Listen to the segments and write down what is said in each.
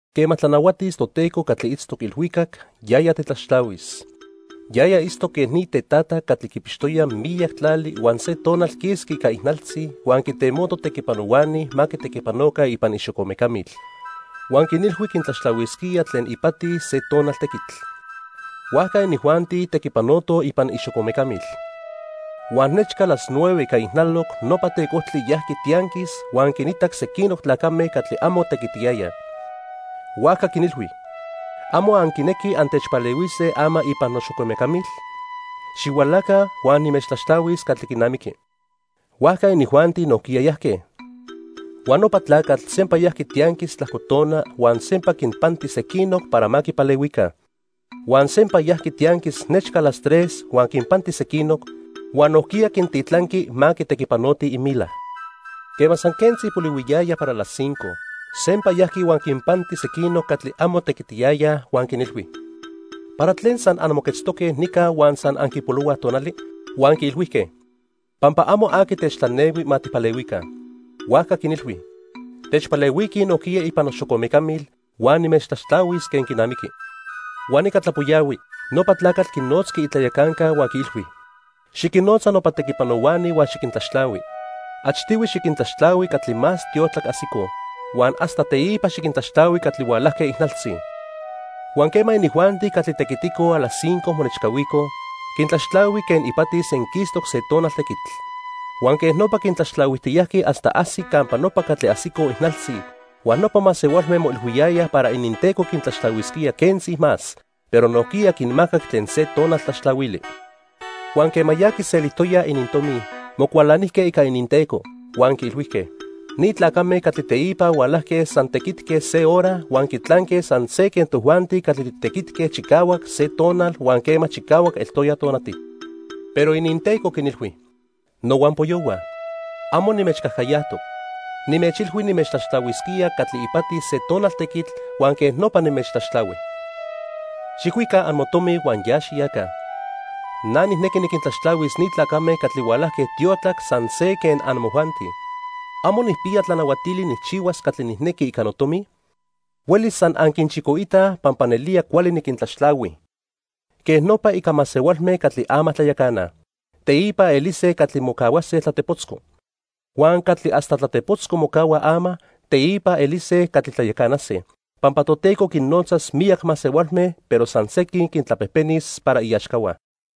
"Quema tlanahuatis Toteco catli itztoc ilhuicac, yaya tetlaxtlahuis. Yaya itztoc quen ni tetata catli quipixtoya miyac tlali huan se tonal quisqui ica ijnaltzi huan quintemoto tequipanohuani ma tequipanoca ipan ixocomecamil. Huan quinilhui quintlaxtlahuisquía tlen ipati se tonal tequitl. Huajca inijuanti tequipanotoj ipan ixocomecamil. Huan nechca las nueve ica ijnaloc nopa tecojtli yajqui tianquis huan quinitac sequinoc tlacame catli amo tequitiyayaj. Huajca quinilhui: '¿Amo anquinequij antechpalehuise ama ipan noxocomecamil? Xihualaca huan nimechtlaxtlahuis catli quinamiqui.' Huajca inijuanti nojquiya yajque. Huan nopa tlacatl sempa yajqui tianquis tlajco tona huan sempa quinpanti sequinoc para ma quipalehuica. Huan sempa yajqui tianquis nechca las tres huan quinpanti sequinoc, huan nojquiya quintitlanqui ma tequipanotij imila. Quema san quentzi polihuiyaya para las cinco, sempa yajqui huan quinpanti sequinoc catli amo tequitiyayaj huan quinilhui: '¿Para tlen san anmoquetztoque nica huan san anquipolohuaj tonali?' "Huan quiilhuijque: 'Pampa amo aqui techtlanehui ma tijpalehuica.' "Huajca quinilhui: 'Techpalehuiquij nojquiya ipan noxocomecamil, huan nimechtlaxtlahuis quen quinamiqui.' "Huan ica tlapoyahui, nopa tlacatl quinotzqui itlayacanca huan quiilhui: 'Xiquinnotza nopa tequipanohuani huan xiquintlaxtlahui. Achtihui xiquintlaxtlahui catli más tiotlac ajsicoj, huan hasta teipa xiquintlaxtlahui catli hualajque ijnaltzi.' "Huan quema inijuanti catli tequiticoj a las cinco monechcahuicoj, quintlaxtlahui quen ipati senquistoc se tonal tequitl. Huan quej nopa quintlaxtlahuijtiyajqui hasta ajsic campa nopa catli ajsicoj ijnaltzi, huan nopa masehualme moilhuiyayaj para ininteco quintlaxtlahuisquía quentzi más, pero nojquiya quinmacac tlen se tonal tlaxtlahuili. Huan quema ya quiselijtoyaj inintomi, mocualanijque ica ininteco. Huan quiilhuijque: 'Ni tlacame catli teipa hualajque san tequitque se hora huan quitlanque san se quen tojuanti catli titequitque chicahuac se tonal huan quema chicahuac eltoya tonati.' "Pero ininteco quinilhui: 'Nohuampoyohua, amo nimechcajcayajtoc. Nimechilhui nimechtlaxtlahuisquía catli ipati se tonal tequitl huan quej nopa nimechtlaxtlahui. Xijcuica amotomi huan ya xiyaca. Na nijnequi niquintlaxtlahuis ni tlacame catli hualajque tiotlac san se quen amojuanti. ¿Amo nijpiya tlanahuatili nijchihuas catli nijnequi ica notomi? Huelis san anquinchicoitaj pampa nelía cuali niquintlaxtlahui.' "Quej nopa ica masehualme catli ama tlayacanaj, teipa elise catli mocahuase tlatepotzco. Huan catli hasta tlatepotzco mocahuaj ama, teipa elise catli tlayacanase, pampa Toteco quinnotzas miyac masehualme pero san sequin quintlapejpenis para iaxcahua."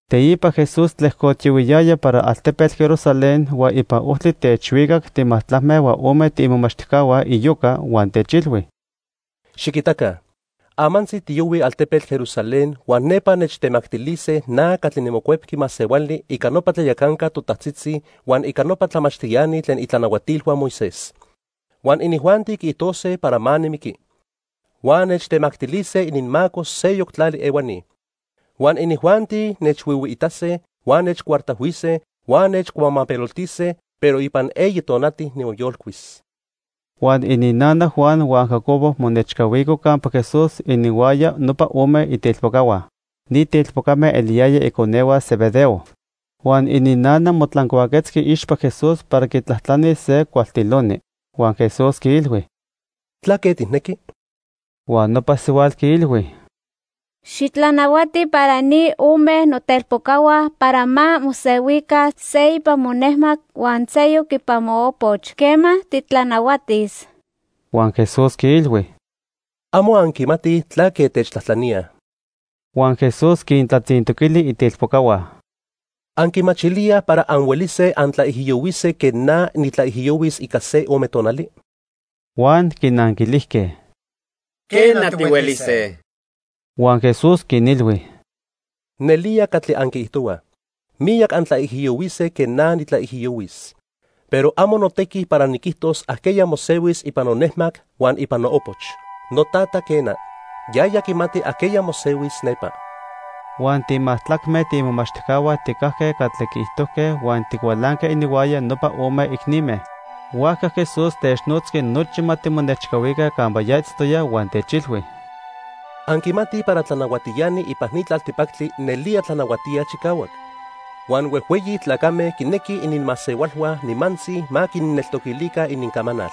Teipa Jesús tlejcotiyohuiyaya para altepetl Jerusalén, huan ipan ojtli techhuicac timajtlacme huan ome tiimomachtijcahua iyoca huan techilhui: —Xiquitaca. Amantzi tiyohuij altepetl Jerusalén huan nepa nechtemactilise na catli niMocuepqui Masehuali ica nopa tlayacanca totajtzitzi huan ica nopa tlamachtiani tlen itlanahuatilhua Moisés. Huan inijuanti quiijtose para ma nimiqui. Huan nechtemactilise ininmaco seyoc tlali ehuani. Huan inijuanti nechhuihuiitase huan nechcuartajhuise, huan nechcuamapeloltise. Pero ipan eyi tonati nimoyolcuis. Huan ininnana Juan huan Jacobo monechcahuico campa Jesús ininhuaya nopa ome itelpocahua. Ni telpocame eliyayaj iconehua Zebedeo. Huan ininnana motlancuaquetzqui iixpa Jesús para quitlajtlanis se cualtiloni. Huan Jesús quiilhui: —¿Tlaque tijnequi? Huan nopa sihuatl quiilhui: —Xitlanahuati para ni ome notelpocahua para ma mosehuica, se ipan monejmac huan seyoc ipan moopoch quema titlanahuatis. Huan Jesús quinilhui: —Amo anquimatij tlaque techtlajtlaníaj. Huan Jesús quintlatzintoquili itelpocahua: —¿Anquimachilíaj para anhuelise antlaijiyohuise quen na nitlaijiyohuis ica se ome tonali? Huan quinanquilijque: —Quena, tihuelise. Huan Jesús quinilhui: —Nelía catli anquiijtohuaj, miyac antlaijiyohuise quen na nitlaijiyohuis, pero amo notequi para niquijtos ajqueya mosehuis ipan nonejmac huan ipan noopoch. NoTata, quena, yaya quimati ajqueya mosehuis nepa. Huan timajtlacme tiimomachtijcahua tijcajque catli quiijtojque huan ticualanque ininhuaya nopa ome icnime. Huajca Jesús technotzqui nochi ma timonechcahuica campa ya itztoya, huan techilhui: —Anquimatij para tlanahuatiani ipan ni tlaltipactli nelía tlanahuatíaj chicahuac. Huan huejhueyi tlacame quinequij ininmasehualhua nimantzi ma quinneltoquilica inincamanal.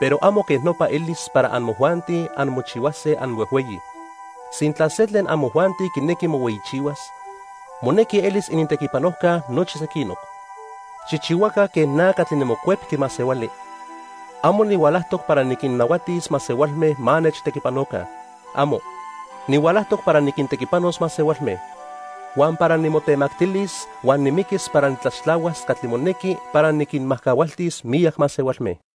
Pero amo quej nopa elis para amojuanti anmochihuase anhuejhueyi. Sintla se tlen amojuanti quinequi mohueyichihuas, monequi elis inintequipanojca nochi sequinoc. Xijchihuaca quen na catli niMocuepqui Masehuali. Amo nihualajtoc para niquinnahuatis masehualme ma nechtequipanoca. ¡Amo! Nihualajtoc para niquintequipanos masehualme, huan para nimotemactilis huan nimiquis para nitlaxtlahuas catli monequi para niquinmajcahualtis miyac masehualme.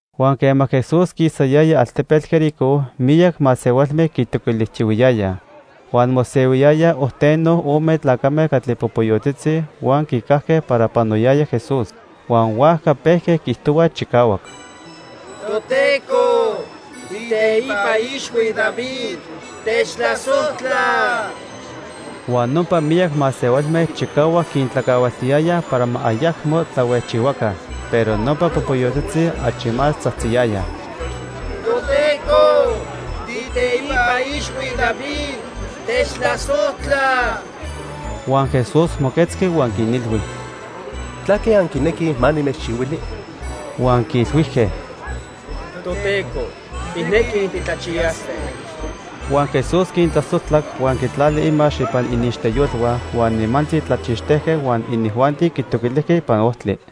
Huan quema Jesús quisayaya altepetl Jericó, miyac masehualme quitoquilijtiyohuiyayaj. Huan mosehuiyayaj ojteno ome tlacame catli popoyotzitzi huan quicajque para panoyaya Jesús. Huan huajca pejque quiijtohuaj chicahuac: —¡Toteco, tiiteipa ixhui David, techtlasojtla! Huan nopa miyac masehualme chicahuac quintlacahualtiyayaj para ma ayacmo tlahuejchihuaca. Pero nopa popoyotzitzi achi más tzajtziyayaj: —¡Toteco, tiiteipa ixhui David, techtlasojtla! Huan Jesús moquetzqui huan quinilhui: —¿Tlaque anquinequij ma nimechchihuili? Huan quiilhuijque: —Toteco, tijnequij titlachiyase. Huan Jesús quintlasojtlac huan quitlali imax ipan iniixteyolhua huan nimantzi tlachixtejque huan inijuanti quitoquilijque ipan ojtli.